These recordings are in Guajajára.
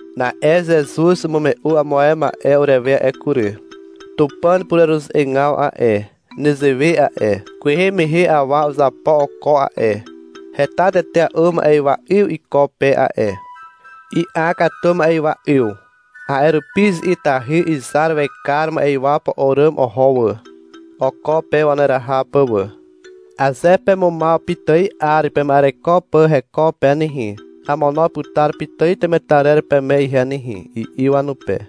Na'e Zezuz umume'u amo ae ma'e urewe a'e kury. — Tupàn pureruze'egaw a'e, nezewe a'e. Kwehe mehe awa uzapo oko a'e. Heta tetea'u ma'ywa 'yw iko pe a'e. I'a katu ma'ywa 'yw. A'e rupi izi'itahy izar wekar ma'ywa po'o àràm oho wà, oko pe waneraha pà wà. — Aze pemumaw pitài 'ar pema'ereko pà heko pe nehe, amono putar pitài temetarer peme ihe nehe, i'i wanupe.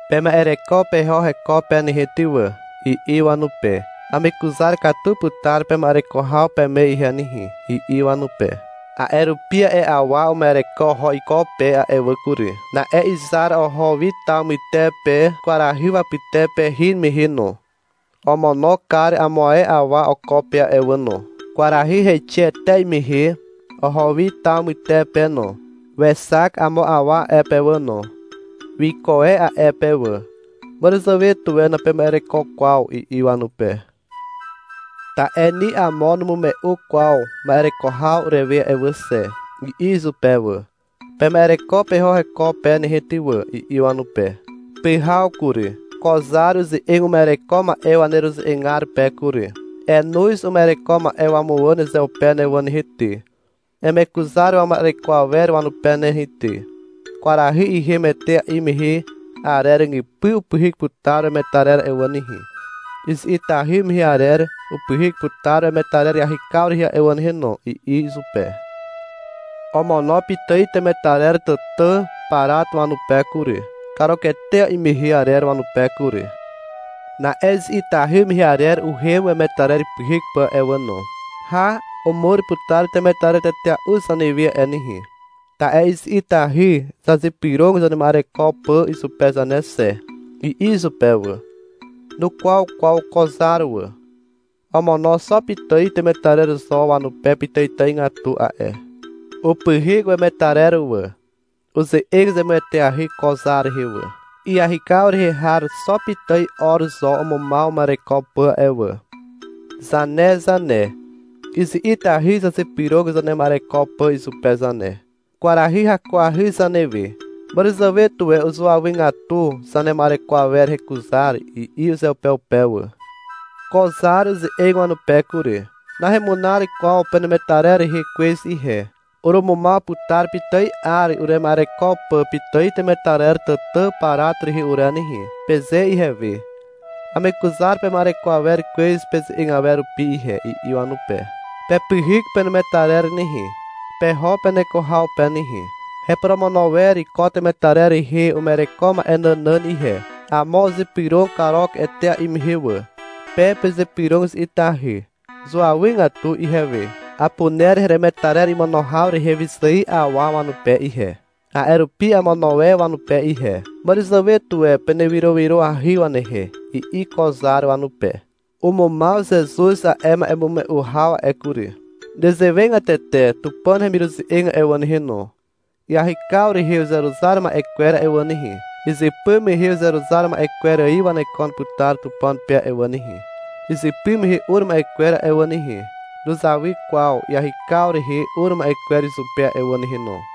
— Pema'ereko peho heko pe nehe ty wà, i'i wanupe. — Amekuzar katu putar pema'ereko haw peme ihe nehe, i'i wanupe. A'e rupi a'e awa uma'ereko oho iko pe a'e wà kury. Na'e izar oho wi taw mytepe kwarahy wapytepe hin mehe no. Omono kar amo ae awa oko pe a'e wà no. Kwarahy heixe etea'i mehe oho wi taw mytepe no. Wexak amo awa a'e pe wà no. Wiko e a'e pe wà. — Màràzàwe tuwe napema'ereko kwaw, i'i wanupe. — Ta'e ni amo numume'u kwaw ma'ereko haw urewe a'e wà xe, i'i izupe wà. — Pema'ereko peho heko pe nehe ty wà, i'i wanupe. Pyhaw kury. Ko zar uze'eg uma'ereko ma'e waneruze'egar pe kury. — Enoz uma'ereko ma'e wamuwà nezeupe ne wà nehe ty. Emekuzar wama'ereko awer wanupe nehe ty. Kwarahy ihem etea'i mehe arer ràgypy upyhyk putar wemetarer a'e wà nehe. Izi'itahy mehe arer upyhyk putar wemetarer iahykaw rehe a'e wà nehe no, i'i izupe. Omono pitài temetarer tàtà parat wanupe kury, karuketea'i mehe arer wanupe kury. Na'e izi'itahy mehe arer uhem wemetarer ipyhyk pà a'e wà no. — Hà, umur putar temetarer tetea'u zanewe a'e nehe, ta'e izi'itahy zazypyrog zanema'ereko pà izupe zane xe, i'i izupe wà. Nukwaw kwaw ko zar wà. Omono xo pitài temetarer zo wanupe pitàitàigatu a'e. Upyhyk wemetarer wà. Uze'eg zemueteahy ko zar rehe wà. — Iahykaw rehe har xo pitài 'or zo umumaw uma'ereko pà a'e wà. Zane zane, izi'itahy zazypyrog zanema'ereko pà izupe zane. Kwarahy hakuahy zanewe. Màràzàwe tuwe uzuawygatu zanema'ereko awer hekuzar, i'i uzeupeupe wà. Ko zar uze'eg wanupe kury. — Nahemunar kwaw penemetarer rehe kwez ihe. — Urumumaw putar pitài 'ar urema'ereko pà pitài temetarer tàtà parat rehe ure nehe, peze ihewe. Amekuzar pema'ereko awer kwez peze'eg awer rupi ihe, i'i wanupe. — Pepyhyk penemetarer nehe, peho peneko haw pe nehe. Heporomono wer ko temetarer rehe uma'ereko ma'e nànàn ihe. Amo uzypyrog karuk etea'i mehe wà. Pe pezypyrog izi'itahy. Zuawygatu ihewe. Apuner heremetarer imono haw rehe wyzài awa wanupe ihe. A'e rupi amono e wanupe ihe. Màràzàwe tuwe penewyrowyroahy wanehe, i'i ko zar wanupe. Umumaw Zezuz a'e ma'emume'u haw a'e kury. Nezewegatete Tupàn hemiruze'eg a'e wà nehe no. Iahykaw rehe uzeruzar ma'e kwer a'e wà nehe, izypy mehe uzeruzar ma'e kwer ài wanekon putar Tupàn pe a'e wà nehe. Izypy mehe ur ma'e kwer a'e wà nehe, nuzawy kwaw iahykaw rehe ur ma'e kwer izupe a'e wà nehe no.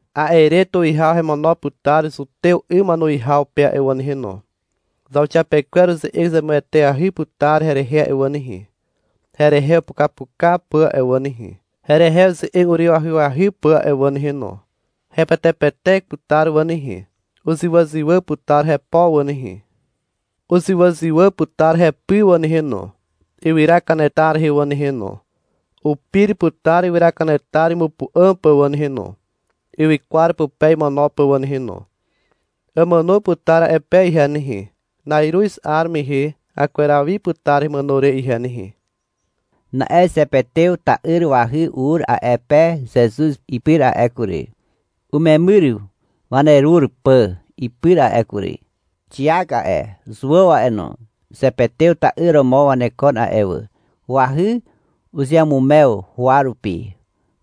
A'e re tuwihaw hemono putar Zutew 'ym wanuwihaw pe a'e wà nehe no. Zauxiapekwer uze'eg zemueteahy putar herehe a'e wà nehe, herehe upukapuka pà a'e wà nehe, herehe uze'eg uryw ahyahy pà a'e wà nehe no. Hepetepetek putar wà nehe. Uzywàzywà putar hepo wà nehe. Uzywàzywà putar hepy wà nehe no, ywyra kanetar rehe wà nehe no. Upir putar ywyra kanetar imupu'àm pà wà nehe no, ywykwar pupe imono pà wà nehe no. Àmàno putar a'e pe ihe nehe. Na'iruz 'ar mehe akweraw wi putar hemàno re ihe nehe. Na'e Zepetew ta'yr wahy ur a'e pe Zezuz ipyr a'e kury, umemyr wanerur pà ipyr a'e kury. (Xiak a'e, Zuàw a'e no, Zepetew ta'yr romo wanekon a'e wà.) Wahy uzeamumew huwa rupi,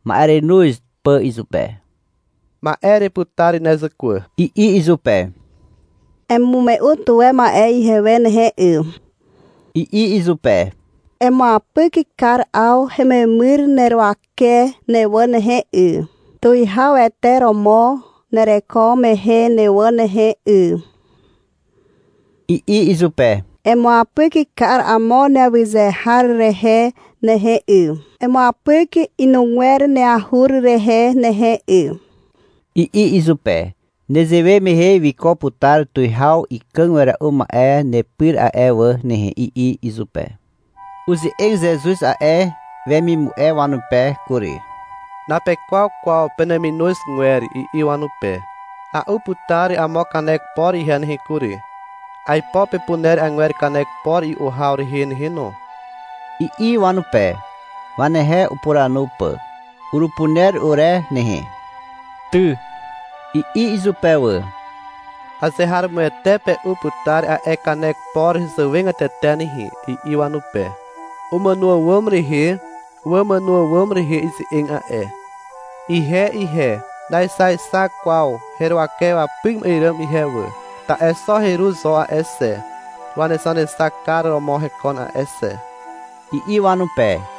ma'erenoz pà izupe. — Ma'e ereputar ne, zàkwà, i'i izupe. — Emume'u tuwe ma'e ihewe nehe, 'y, i'i izupe. — Emuapyk kar 'aw hememyr neruwake ne wà nehe, 'y, Tuwihawete romo nereko mehe ne wà nehe, 'y, i'i izupe. — Emuapyk kar amo neawyze har rehe nehe, 'y, emuapyk inugwer neahur rehe nehe, 'y, i'i izupe. (Nezewe mehe wiko putar tuwihaw ikàg wera'u ma'e nepyr a'e wà nehe, i'i izupe.) Uze'eg Zezuz a'e wemimu'e wanupe kury. — Napekwaw kwaw peneminozgwer, i'i wanupe. — A'u putar amo kanek por ihe nehe kury. Aipo pepuner agwer kanek por i'u haw rehe nehe no, i'i wanupe, wanehe upuranu pà. — Urupuner ure nehe, ty, i'i izupe wà. — Azeharomoete pe'u putar a'e kanek por hezàwegatete nehe, i'i wanupe. (Umàno àwàm rehe wamàno àwàm rehe ize'eg a'e.) — Ihe ihe, naexaexak kwaw heruwake wapyk ma'e ràm ihe wà. Ta'e xo heru zo a'e xe, wanexanexakar romo hekon a'e xe, i'i wanupe.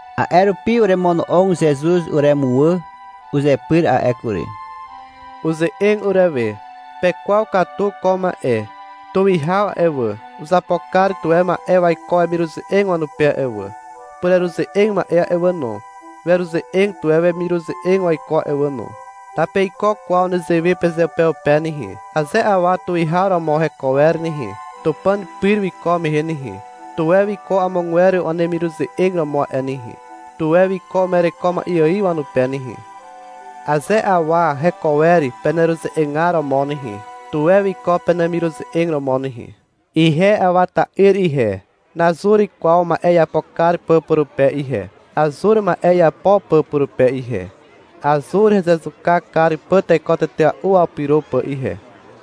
A'e rupi uremono'og Zezuz uremuwà uzepyr a'e kury. Uze'eg urewe. — Pekwaw katu ko ma'e. Tuwihaw a'e wà, uzapo kar tuwe ma'e waiko wemiruze'eg wanupe a'e wà. Pureruze'eg ma'e a'e wà no, weruze'eg tuwe wemiruze'eg waiko a'e wà no. Napeiko kwaw nezewe pezeupeupe nehe. Aze awa tuwihaw romo heko wer nehe, Tupàn pyr wiko mehe nehe, tuwe wiko amogwer wanemiruze'eg romo a'e nehe. Tuwe wiko uma'ereko ma'e ài wanupe nehe. Aze awa heko wer peneruze'egar romo nehe, tuwe wiko penemiruze'eg romo nehe. Ihe Awa ta'yr ihe, nazur kwaw ma'e iapo kar pà purupe ihe. Azur ma'e iapo pà purupe ihe. Azur hezezuka kar pà teko tetea'u wapyro pà ihe.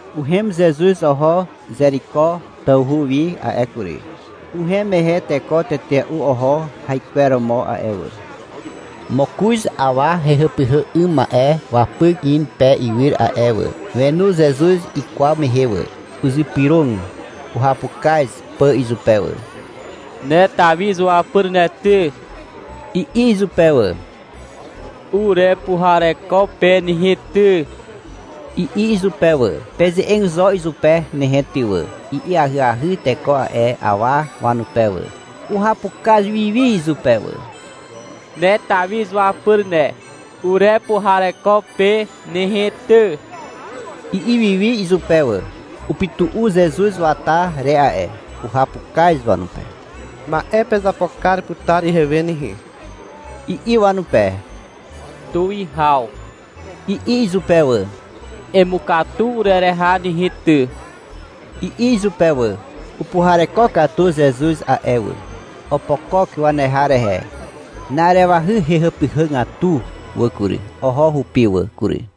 Uhem Zezuz oho Zeriko tawhu wi a'e kury. Uhem mehe teko tetea'u oho haikweromo a'e wà. Mokoz awa hehàpyhà 'ym ma'e wapyk in pe iwyr a'e wà. Wenu Zezuz ikwaw mehe wà. Uzypyrog uhapukaz pà izupe wà. — Ne Tawi izuapyr ne ty, i'i izupe wà. — Urepuhareko pe nehe ty, i'i izupe wà. — Peze'eg zo izupe nehe ty wà, i'i ahyahy teko a'e awa wanupe wà. Uhapukaz wi wi izupe wà. — Ne Tawi izuapyr ne, urepuhareko pe nehe ty, i'i wi izupe wà. Upytu'u Zezuz wata re a'e. Uhapukaz wanupe. — Ma'e pezapo kar putar ihewe nehe, i'i wanupe. — Tuwihaw, i'i izupe wà. — Emukatu urereha nehe ty, i'i izupe wà. Upuhareko katu Zezuz a'e wà. Opokok waneha rehe. Na'arewahy hehàpyhàgatu wà kury. Oho hupi wà kury.